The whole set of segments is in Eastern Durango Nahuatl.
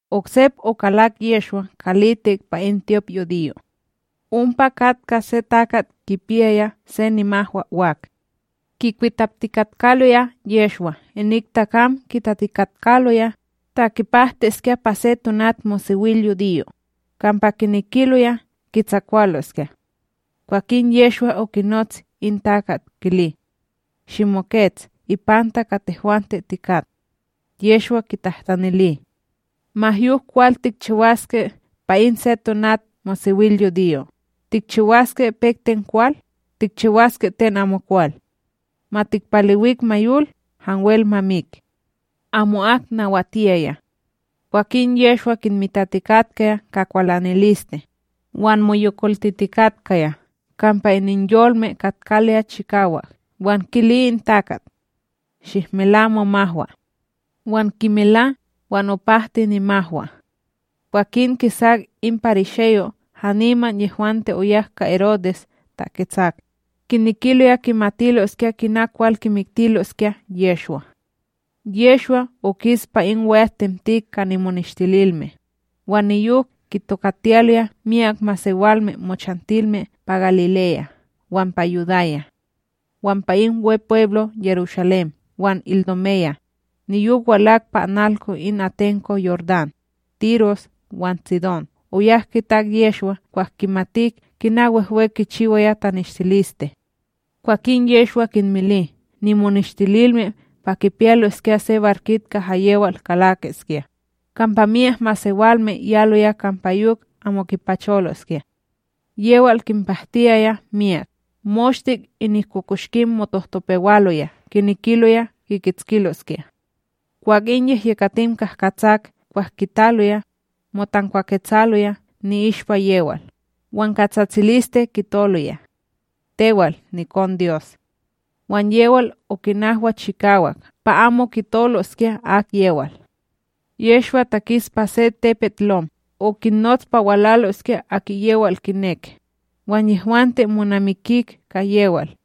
Oksep okalak Yehshwa kalitik pa in tyopYudiyo; ompa katka se takat kipiyaya se nimahwa wak. Kikwitaptikatkaloya Yehshwa inik takam kitatikatkaloya ta kipahtiskya pa se tonatmosewilyudiyo, kampa kinekiloya kitsakwaloskya. Kwakin Yehshwa okinots in takat kili: ―Shimokets ipanta ka tehwante tikat. Yehshwa kintahtanili: ―Ma yok kwal tikchiwaske pa in se tonatmosewilyudiyo, tikchiwaske pek ten kwal, tikchiwaske ten amokwal? Ma tikpalewik ma yol, hanwel ma mik? Amo'ak nawatiyaya. Kwakin Yehshwa kinmitatikatka ka kwalaniliste, wan moyokoltitikatkaya kampa ininyolme katkaloya chikawak, wan kili in takat: ―Shihmela momahwa. Wan kimela, wan opahti nimahwa. Kwakin kisak in parisheyo' haniman yehwante oyak ka Herodes taketsak, kinekiloya kimatiloskya kina kwal kimiktiloskya Yehshwa. Yehshwa okis pa in we'atTemtik ka nimoneshtililme, wan niyok kitokatiyaloya myak masewalme mochantilme pa Galileya wan pa Yudaya. Wan pa in Wepweblo Yerushalém wan Idumeya, niyok walak pa analko in atenko Yordán, Tiros wan Tsidón oyak kitak Yehshwa kwah kimatik kina wehwe kichiwaya taneshtiliste. Kwakin Yehshwa kinmili nimoneshtililme pa kipiyaloskya se barkit kaha yewal kalakiskya, kampa myak masewalme yaloya kampa yok amo kipacholoskya. Yewal kinpahtiyaya myak, moshte inik kokoshkim motohtopewaloya kinekiloya kikitskiloskya. Kwah in yehyekatim kahkatsak kwah kitaloya, motankwaketsaloya ni'ishpa yewal wan ka tsatsiliste kitoloya: ―Tewal nikonDyos! Wan yewal okinahwa chikawak pa amo kitoloskya akyewal. Yehshwa takis pa se tepetLom, okinnots pa walaloskya aki yewal kinek, wan yehwante monamikik ka yewal.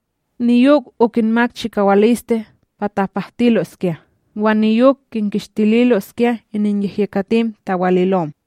niyok okinmak chikawaliste pa tapahtiloskya wan niyok kinkishtililoskya ininyehyekatim tawalilom.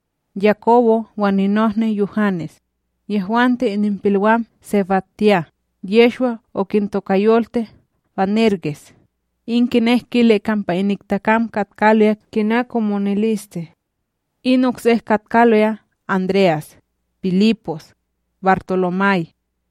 Yakobo wan ninohni Yuhanes, yehwante ininpilwam SebadYah, Yehshwa okintokayolti Banerges, in kinek kili kampa inik takam katkaloya kina komoniliste; in oksek katkaloya André'as, Pilipos, BarTolomay,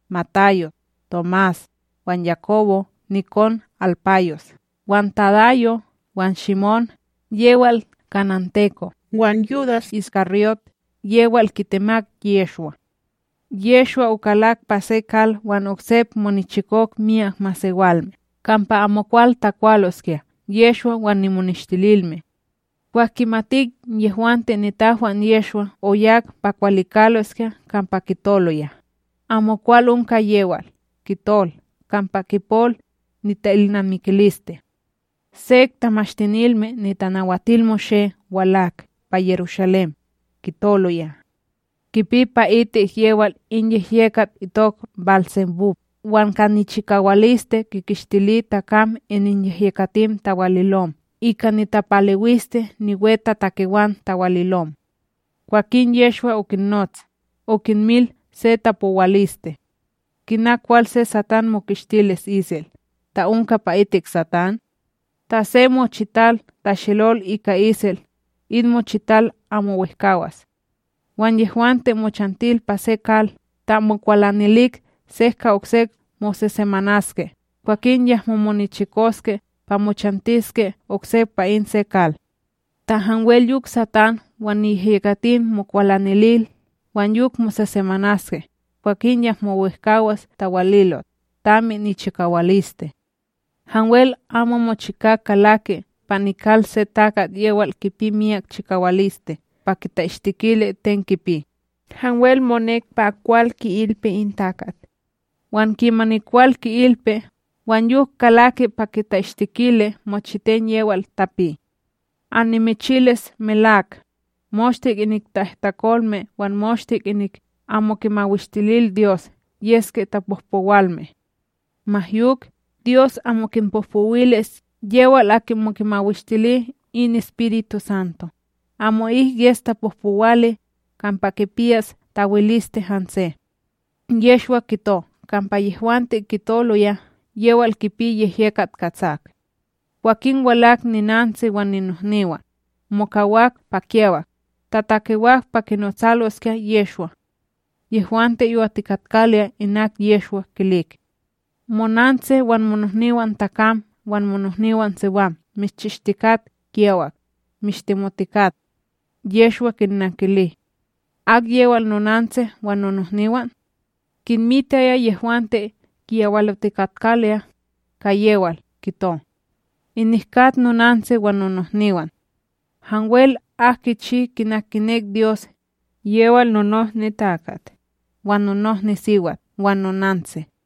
Matayos, Tomás, wan Yakobo nikon Halpayos, wan Tadayo wan Shimón yewal kananteko, wan Yudas IshKaryót, yewal kitemak Yehshwa. Yehshwa okalak pa se kal wan oksep monichikok myak masewalme, kampa amokwal takwaloskya Yehshwa wan nimoneshtililme. Kwah kimatik yehwante nitahwan Yehshwa, oyak pa kwalikaloskya kampa kitoloya, amokwal onka yewal, kitol kampa kipol nita'ilnamikiliste. Sek Tamashtinilme NitanawatilMoshé walak pa Yerushalém, kitoloya: ―Kipi pa'itik yewal in yehyekat itok BálSebúb, wan ka nichikawaliste kinkishtili takam ininyehyekatim tawalilom ika nitapalewiliste niwetatakewan tawalilom. Kwakin Yehshwa okinnots, okinmil se tapowaliste: ―Kina kwal se Satán mokishtili isel, ta onka pa itik Satán? Ta se mochital tashelol ika isel, in mochital amo wehkawas; wan yehwante mochantil pa se kal, ta mokwalanilik se ka okse mosesemanaske, kwakin yahmo monichikoske pa mochantiske oksep pa in se kal. Ta hanwel yok Satán wan niyehyekatim mokwalanilil wan yok mosesemanaske, kwakin yahmo wehkawas tawalilot, tami nichikawaliste. ’Hanwel amo mochika kalaki pa nikal se takat yewal kipi miyak chikawaliste pa kita'ishtikili ten kipi, hanwel monek pa kwal ki'ilpi in takat; wan kimani kwal ki'ilpi, wan yok kalaki pa kita'ishtikili mochiten yewal tapi. ’Annimichilis melak, moshte inik ta'ihtakolme wan moshte inik amo kimawishtililDyos yeske tapohpowalme; ma yok, Dyos amo kinpohpowilis yewal aki amo kimawishtili in EspirituSanto, amo'ik yes tapohpowali kampa kipiyas tawikiliste hanse. Yehshwa kito kampa yehwante kitoloya yewal kipi yehyekat katsak. Kwakin walak ninantsi wan ninohniwan, mokawak pa kiyawak, tatakewak pa kinotsaloskya Yehshwa. Yehwante yowatikatkaloya inak Yehshwa kilik: ―Monantsi wan monohniwanTakam wan monohniwanSiwam mishchishtikat kiyawak, mishtemotikat. Yehshwa kinnankili: ―Akyewal nonantsi wan nonohniwan? Kinmitaya yehwante kiyawalotikatkaloya, ka yewal, kito: ―Inik kat nonantsi wan nonohniwan. Hanwel ak kichi kina kinek Dyos, yewal nonohniTakat, wan nonohniSiwat wan nonantsi.